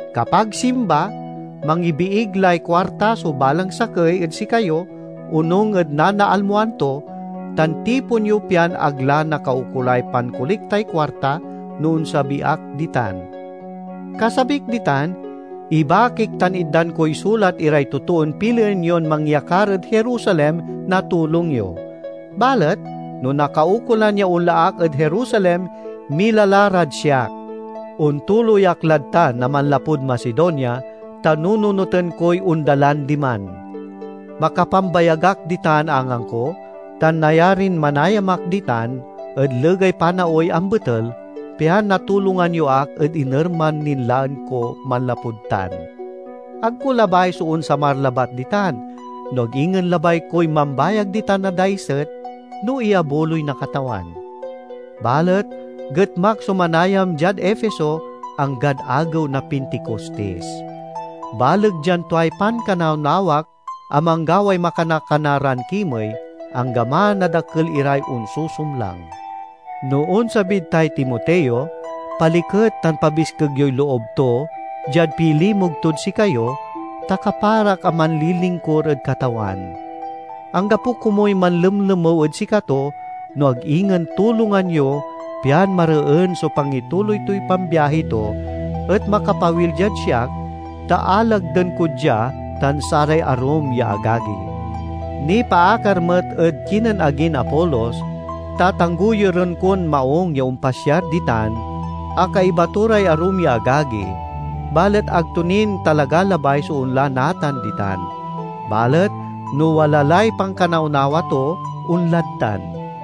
Kapag Simba mangibiig lay kuarta so balang sakey ed sikayo onung ed nanaalmoan to, tan tipon yo pian ag la nakaukolay pankoliktay kuarta, no onsabi ak ditan. Kasabik ditan, ibakik tan itdan koy sulat iray totoon pilien yon mangyakar ed Jerusalem na tulong yo. Balet, no nakaukolan ya onla ak ed Jerusalem, mila la rad siak. Ontuloy ak lad tan a manlapud Macedonia, ta nununoten koy ondalan diman. Makapambayag ak ditan angangko tan nayarin manayam ak ditan ed legay panaoy ambetel, pian natulongan yo ak ed inerman nin laen ko manlapud tan. Ag ko labay so onsamar labat ditan, no ag ingen labay koy mambayag ditan na daiset, no iyabuloy na Katawan. Balet getmak so manayam diad Efeso, anggad agew na Pinticostis. Baleg dian tuay pankanawnawak a manggaway makana-kana ran kimey, anggaman a dakel iray onsusumlang. No onsabid tay Timoteo, paliket tan pabiskeg yoy loob to diad pilimug tod sikayo, ta kaparak a manlilingkur ed Katawan. Anggapo komuy manlemlemew ed sikato, no ag ingen tulongan yo pian mareen so pangituloy toy pambiahi to, et makapawil diad siak, ta alagden ko dia tan saray arum ya agagi. Nipaakar met ed kinen agin Apolos: tatanggoyuren kon maung ya ompasyar ditan a kaiba to ray arum ya agagi, balet ag to nin talaga labay so onla natan ditan. Balet no wala lay pankanawnawa to, onlad tan.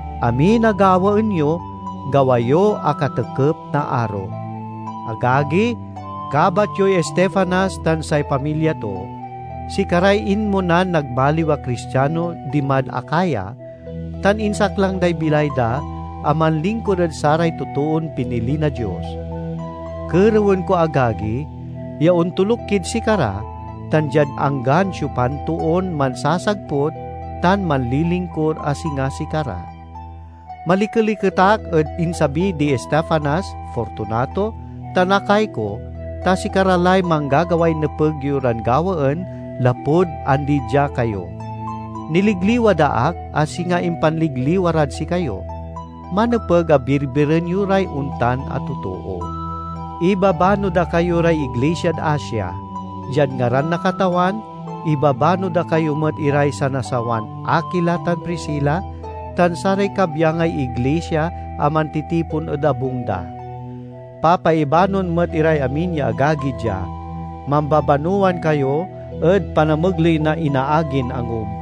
Amin a gawaen yo, gawa yo a katekep na aro. Agagi, kabat yoy Estefanas tan say pamilya to; sikaray inmonan nagmaliw a Cristiano dimad Acaya, tan insaklang day bilay da a manlingkur ed saray totoon pinili na Dios. Kerewen ko, agagi, ya ontoluk kid sikara, tan diad anggan siopan toon mansasagput tan manlilingkur a singa sikara. Malikeliket ak ed insabi di Estefanas, Fortunato, tan Acaico, ta sikara lay manggagaway nepeg yo ran gawaen lapud andi dia kayo. Niligliwa da ak, a singa impanligliwa rad sikayo. Manepeg a birbiren yo ray ontan a totoo. Ibabano da kayo ray iglisiad Asia. Diad ngaran na Katawan, ibabano da kayo met iray sanasawan Akila tan Priscila tan saray kabyangay iglisia a mantitipon ed abung da. Papaibanoan met iray amin ya agagi dia. Mambabanowan kayo ed panamegley na inaagin angub.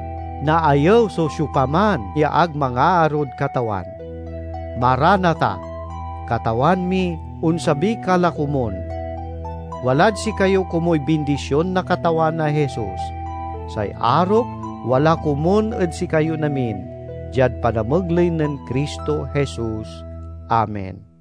Naayew so siopaman ya ag mangaarod Katawan! Marana tha–Katawan mi, onsabi ka la komun! Walad sikayo komuy bindision na Katawan a Jesus. Say arok wala komun ed sikayon amin, diad panamegley nen Cristo Jesus. Amen.